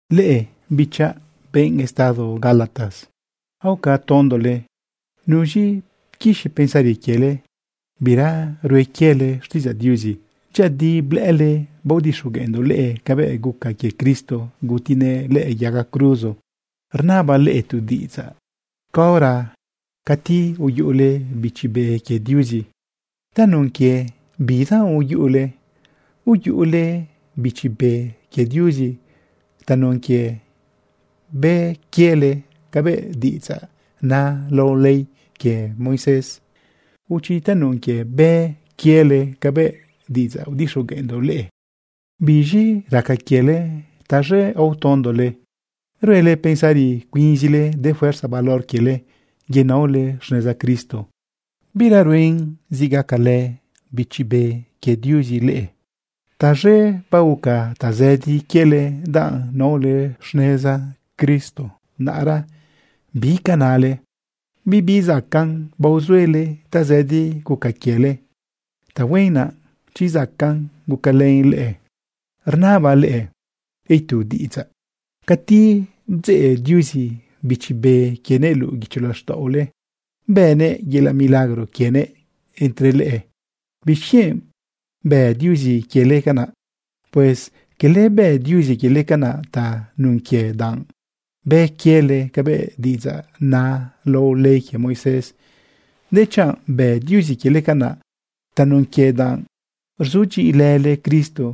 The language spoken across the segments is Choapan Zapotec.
¡Leꞌe, bichaꞌ, benꞌ estado Gálatas, aoca tondole! ¿Nuz̃i pquixi pensari quiele bira hue quiele xtiꞌidzaꞌ Diuzi? Dyëꞌëdi blëꞌële baodixogueꞌndoꞌ leꞌe cabëꞌ guca quie Cristo gutinëꞌ lëꞌë yaga cruzo. Rnabaꞌ leꞌe tu diꞌidzaꞌ: Caora cati uyuꞌule Bichi Be quie Diuzi, ¿tanun quie bidanꞌ uyuꞌule? ¿Uyuꞌule Bichi Be quie Diuzi tanun quie bë quiele cabëꞌ diꞌidzaꞌ na lao ley quie Moisés, o chi tanun quie bë quiele cabëꞌ diꞌidzaꞌ udixogueꞌndoꞌ leꞌe? ¿Biz̃i raca quiele taz̃e aotondole? ¿Ruele pensari cuinzile de fuerza valor quiele yenaole xneza Cristo, bira ruen zi gacalë Bichi Be quie Diuzi leꞌe? Taz̃e baoca tazëdi quiele danꞌ naole xneza Cristo. Naꞌra ¿bi ca nale? ¿Bibi zacaꞌn baozuele tazëdi guca quiele? Tahuen naꞌ chi zacaꞌn gucalën leꞌe. Rnabaꞌ leꞌe itu diꞌidzaꞌ: Cati bdzeꞌ Diuzi Bichi Be quienëꞌ luꞌu guicho laxtaꞌole, bënëꞌ yelaꞌ milagro quienëꞌ entre leꞌe, ¿bixquienꞌ bë Diuzi quiele canaꞌ? Pues cala bë Diuzi quiele canaꞌ tanun quie danꞌ bë quiele cabëꞌ diꞌidzaꞌ na lao ley quie Moisés, dechanꞌ bë Diuzi quiele canaꞌ tanun quie danꞌ rzudyiꞌilële Cristo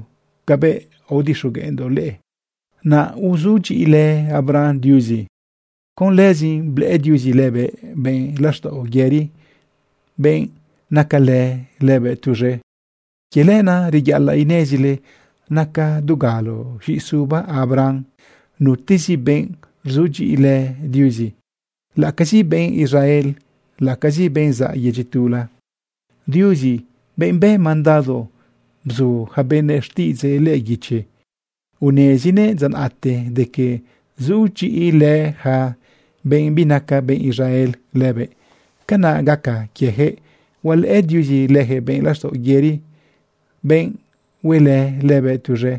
cabëꞌ aodixogueꞌndoꞌ leꞌe. Naꞌ uzudyiꞌilë Abraham Diuzi. Con lëzin blëꞌë Diuzi lëbëꞌ benꞌ laxtaꞌo yëri, benꞌ nacalë lëbëꞌ tuz̃e. Quie lenaꞌ reyaꞌalaꞌ inezile naca dugalo z̃iꞌisuba Abraham nutezi benꞌ rzudyiꞌilë Diuzi, laꞌacazi benꞌ Israel, laꞌacazi benꞌ zaꞌ yedyi tula. Diuzi, benꞌ bë mandado bzu yaca benëꞌ xtiꞌidzëꞌ lëꞌë guichi, unezinëꞌ dza naꞌte de que sudyiꞌilë yaca benꞌ binaca benꞌ Israel lëbëꞌ. Canaꞌ gaca quieyaquëꞌ hualëꞌë Diuzi leyaquëꞌ benꞌ laxtaꞌo yëri, benꞌ hue lëbëꞌ tuz̃e.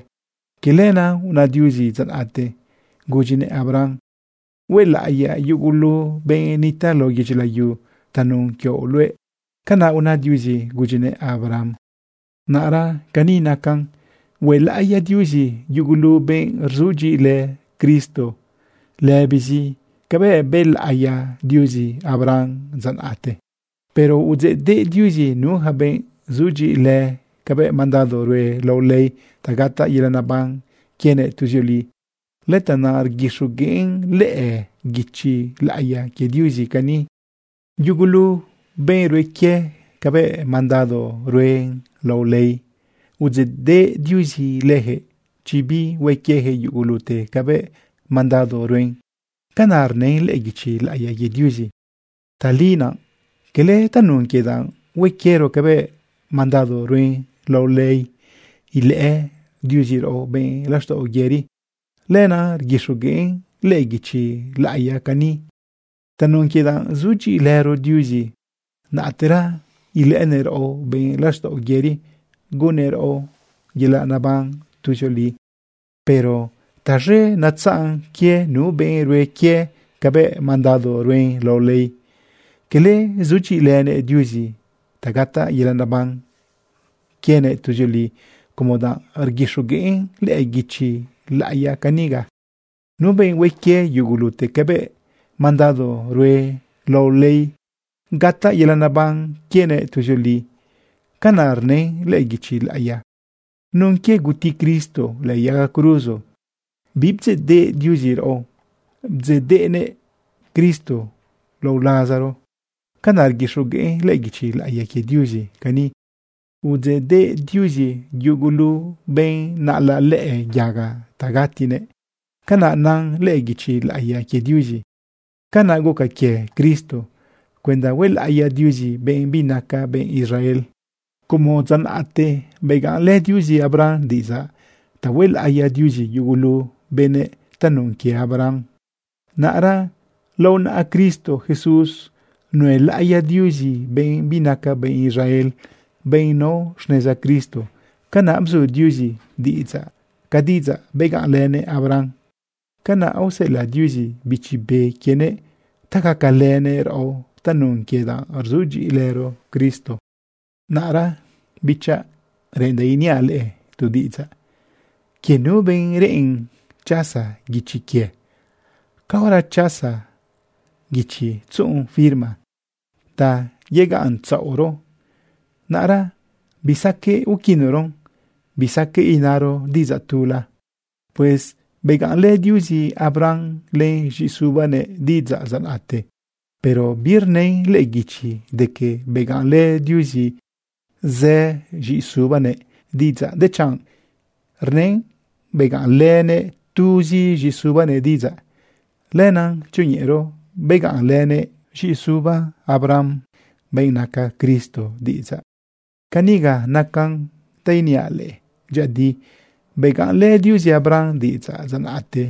Quie lenaꞌ una Diuzi dza naꞌte gudyinëꞌ Abraham: “Huelaꞌiyaꞌ yugulu benꞌ nitaꞌ lao yedyi layu tanun quioꞌ luëꞌ.” Canaꞌ una Diuzi gudyinëꞌ Abraham. Naꞌra cani nacan: Huelaꞌiya Diuzi yugulu benꞌ rzudyiꞌilë Cristo lëbizi cabëꞌ bëlaꞌiya Diuzi Abraham dza naꞌte. Pero udzeꞌdeꞌ Diuzi nu yaca benꞌ sudyiꞌilë cabëꞌ mandado rue lao ley ta gataꞌ yelaꞌ neban quienëꞌ tuzioli. Lëtanaꞌ rguixogueꞌn lëꞌë guichi laꞌiya quie Diuzi cani: “Yugulu benꞌ rue quie cabëꞌ mandado rue lao ley, udzeꞌdeꞌ Diuzi leyaquëꞌ chi bihue quieyaquëꞌ yugulute cabëꞌ mandado ruen.” Canaꞌ rnën lëꞌë guichi laꞌiya quie Diuzi. Tali naꞌ cala tanun quie danꞌ hue quiero cabëꞌ mandado rue lao ley ilëꞌë Diuzi raꞌo benꞌ laxtaꞌo yëri. Lenaꞌ rguixogueꞌn lëꞌë guichi laꞌiya cani: “Tanun quie danꞌ sudyiꞌilëro Diuzi, naꞌtera ilëꞌënëꞌ raꞌo benꞌ laxtaꞌo yëri, gunnëꞌ raꞌo yelaꞌ neban tuzioli.” Pero taz̃e netzaꞌn quie nu benꞌ rue quie cabëꞌ mandado rue lao ley. Cala sudyiꞌilënëꞌ Diuzi ta gataꞌ yelaꞌ neban quienëꞌ tuzioli como danꞌ rguixogueꞌn lëꞌë guichi laꞌiya caniga: “Nu benꞌ hue quie yugulute cabëꞌ mandado rue lao ley, gataꞌ yelaꞌ neban quienëꞌ tuzioli.” Canaꞌ rnën lëꞌë guichi laꞌiya. Nun quie guti Cristo lëꞌë yaga cruzo. bibdzeꞌdeꞌ Diuzi raꞌo, bdzeꞌdeꞌnëꞌ Cristo lao lazaro. Canaꞌ rguixogueꞌn lëꞌë guichi laꞌiya quie Diuzi cani: “Udzeꞌdeꞌ Diuzi yugulu benꞌ naꞌalaꞌ lëꞌë yaga ta gatinëꞌ.” Canaꞌ na lëꞌë guichi laꞌiya quie Diuzi. Canaꞌ guca quie Cristo cuenda huelaꞌiya Diuzi benꞌ binaca benꞌ Israel. Como dza naꞌte begaꞌnlë Diuzi Abraham diꞌidzaꞌ ta huelaꞌiya Diuzi yugulu benëꞌ tanun quie Abraham, naꞌra lao naꞌa Cristo Jesús nuelaꞌiya Diuzi benꞌ binaca benꞌ Israel, benꞌ nao xneza Cristo. Canaꞌ bzu Diuzi diꞌidzaꞌ ca diꞌidzaꞌ begaꞌnlënëꞌ Abraham. Canaꞌ aoseꞌelaꞌ Diuzi Bichi Be quienëꞌ ta gacalënëꞌ raꞌo tanun quie danꞌ rzudyiꞌilëro Cristo. Naꞌra, bichaꞌ, reꞌendaꞌ iniaꞌ leꞌe tu diꞌidzaꞌ quie nu benꞌ reꞌen chasa guichi quie. Caora chasa guichi tzuꞌun firma ta yegaꞌntzaꞌoro, naꞌra bisaqueꞌ uquinoron, bisaqueꞌ inaro diꞌidzaꞌ tula. Pues begaꞌnlë Diuzi Abraham len z̃iꞌisubanëꞌ diꞌidzaꞌ dza naꞌte. Pero birnën lëꞌë guichi de que begaꞌnlë Diuzi zë z̃iꞌisubanëꞌ diꞌidzaꞌ, dechanꞌ rnën begaꞌnlënëꞌ tuzi z̃iꞌisubanëꞌ diꞌidzaꞌ, lenaꞌ tzioñeꞌero begaꞌnlënëꞌ z̃iꞌisuba Abraham, benꞌ naca Cristo, diꞌidzaꞌ. Caniga nacan ta iniaꞌ leꞌe: Dyëꞌëdi begaꞌnlë Diuzi Abraham diꞌidzaꞌ dza naꞌte.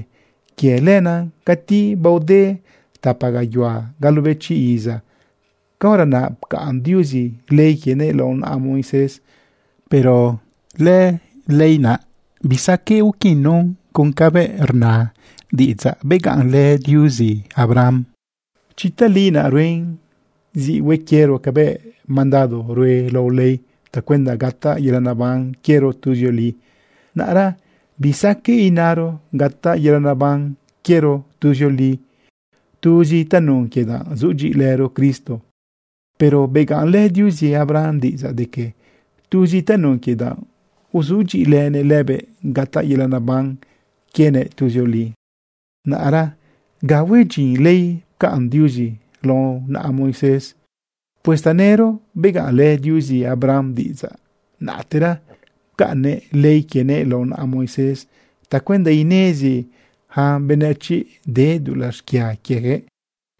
Quie lenaꞌ cati baode tapa gayuhua galobechi iza, caora naꞌ pcaꞌn Diuzi ley quienëꞌ lao naꞌa Moisés. Pero lëley naꞌ bisaqueꞌ uquinon con cabëꞌ rna diꞌidzaꞌ begaꞌnlë Diuzi Abraham. Chi tali naꞌ ruen zi hue quiero cabëꞌ mandado rue lao ley tacuenda gataꞌ yelaꞌ neban quiero tuzioli, naꞌra bisaqueꞌ inaro gataꞌ yelaꞌ neban quiero tuzioli tuzi tanun quie danꞌ sudyiꞌilëro Cristo. Pero begaꞌnlë Diuzi Abraham diꞌidzaꞌ de que tuzi tanun quie danꞌ uzudyiꞌilënëꞌ lëbëꞌ gataꞌ yelaꞌ neban quienëꞌ tuzioli. Naꞌra, ¿ga hue dyin ley pcaꞌn Diuzi lao naꞌa Moisés? Pues tanëro begaꞌnlë Diuzi Abraham diꞌidzaꞌ, naꞌtera pcaꞌnnëꞌ ley quienëꞌ lao naꞌa Moisés tacuenda inezi yaca benëchiꞌ de dulaꞌ xquia quieyaquëꞌ.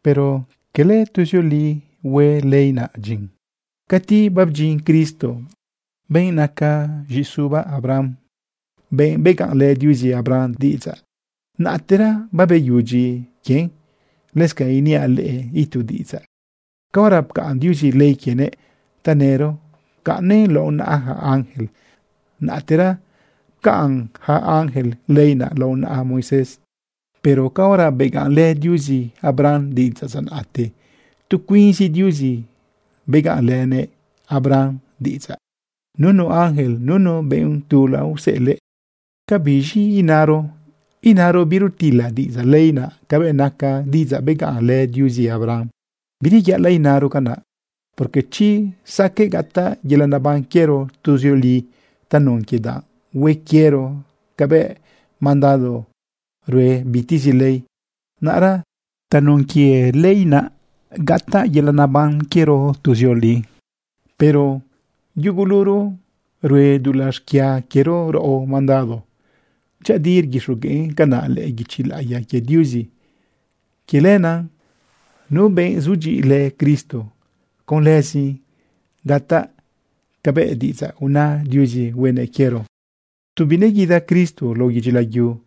Pero cala tuzioli hue ley naꞌ dyin. Cati babdyin Cristo, benꞌ naca z̃iꞌisuba Abraham, benꞌ begaꞌnlë Diuzi Abraham diꞌidzaꞌ, naꞌtera babeyudyi quien. Lëscanꞌ iniaꞌ leꞌe itu diꞌidzaꞌ: Caora pcaꞌn Diuzi ley quienëꞌ, tanëro pcaꞌnnëꞌ lao naꞌa yaca ángel, naꞌtera pcaꞌn yaca ángel ley naꞌ lao naꞌa Moisés. Pero caora begaꞌnlë Diuzi Abraham diꞌidzaꞌ dza naꞌte, tu cuinzi Diuzi begaꞌnlëꞌnëꞌ Abraham diꞌidzaꞌ, nunu ángel, nunu benꞌ tula useꞌelëꞌ. ¿Ca biz̃i inaro? ¿Inaro birutila diꞌidzaꞌ ley naꞌ cabëꞌ naca diꞌidzaꞌ begaꞌnlë Diuzi Abraham? ¡Bireyaꞌalaꞌ inaro canaꞌ! Porque chi saqueꞌ gataꞌ yelaꞌ neban quiero tuzioli tanun quie danꞌ hue quiero cabëꞌ mandado rue bitezi ley, naꞌra tanun quie lëley naꞌ gataꞌ yelaꞌ neban quiero tuzioli. Pero yuguluro rue dulaꞌ xquia quiero raꞌo mandado. Dyëꞌëdi rguixogueꞌn canaꞌ lëꞌë guichi laꞌiya quie Diuzi. Quie lenaꞌ nu benꞌ sudyiꞌilë Cristo, con lëzin gataꞌ cabëꞌ diꞌidzaꞌ una Diuzi huenëꞌ quiero. Tu bineguida Cristo lao yedyi layu,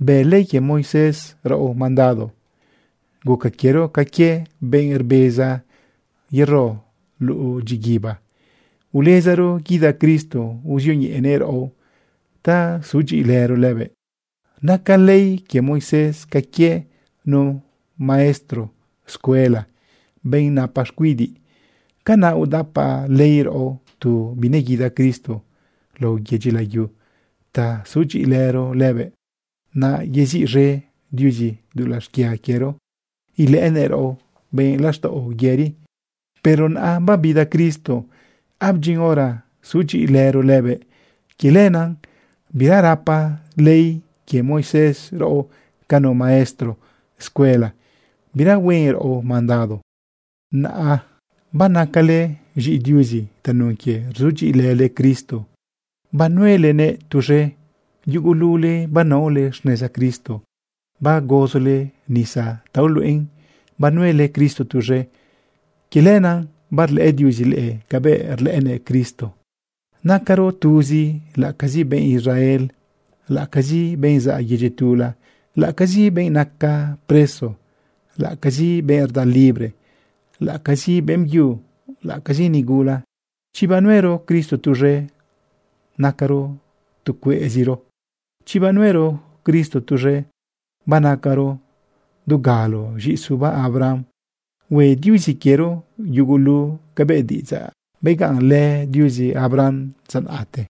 bë ley quie Moisés raꞌo mandado. Guca quiero ca quie benꞌ rbeza yero luꞌu dyiguiba. Ulezaro guida Cristo uzioñeꞌenëꞌ raꞌo ta sudyiꞌilëro lëbëꞌ. Naca ley quie Moisés ca quie nu maestro escuela, benꞌ napa xcuidiꞌ. Canaꞌ udapa ley raꞌo tu bineguida Cristo lao yedyi layu ta sudyiꞌilëro lëbëꞌ, naꞌ yeziꞌz̃e Diuzi dulaꞌ xquia quiero, ilëꞌënëꞌ raꞌo benꞌ laxtaꞌo yëri. Pero naꞌa babida Cristo, abdyin hora sudyiꞌilëro lëbëꞌ. Quie lenaꞌ bira rapa ley quie Moisés raꞌo ca nu maestro escuela, bira huen raꞌo mandado. Naꞌa banacale z̃iꞌi Diuzi tanun quie rzudyiꞌilële Cristo banuelenëꞌ tuz̃e. Yugulule banaole xneza Cristo bagozole nisa ta uluꞌen banuele Cristo tuz̃e. Quie lenaꞌ barlëꞌë Diuzi leꞌe cabëꞌ rlëꞌënëꞌ Cristo. Nacaro tuzi laꞌacazi benꞌ Israel, laꞌacazi benꞌ zaꞌ yedyi tula, laꞌacazi benꞌ naca ca preso, laꞌacazi benꞌ rda libre, laꞌacazi beꞌmbyu, laꞌacazi nigula. Chi banuero Cristo tuz̃e, nacaro tu cueꞌziro. Chi banuero Cristo tuz̃e, banacaro dugalo z̃iꞌisuba Abraham. Hue Diuzi quiero yugulu cabëꞌ diꞌidzaꞌ begaꞌnlë Diuzi Abraham dza naꞌte.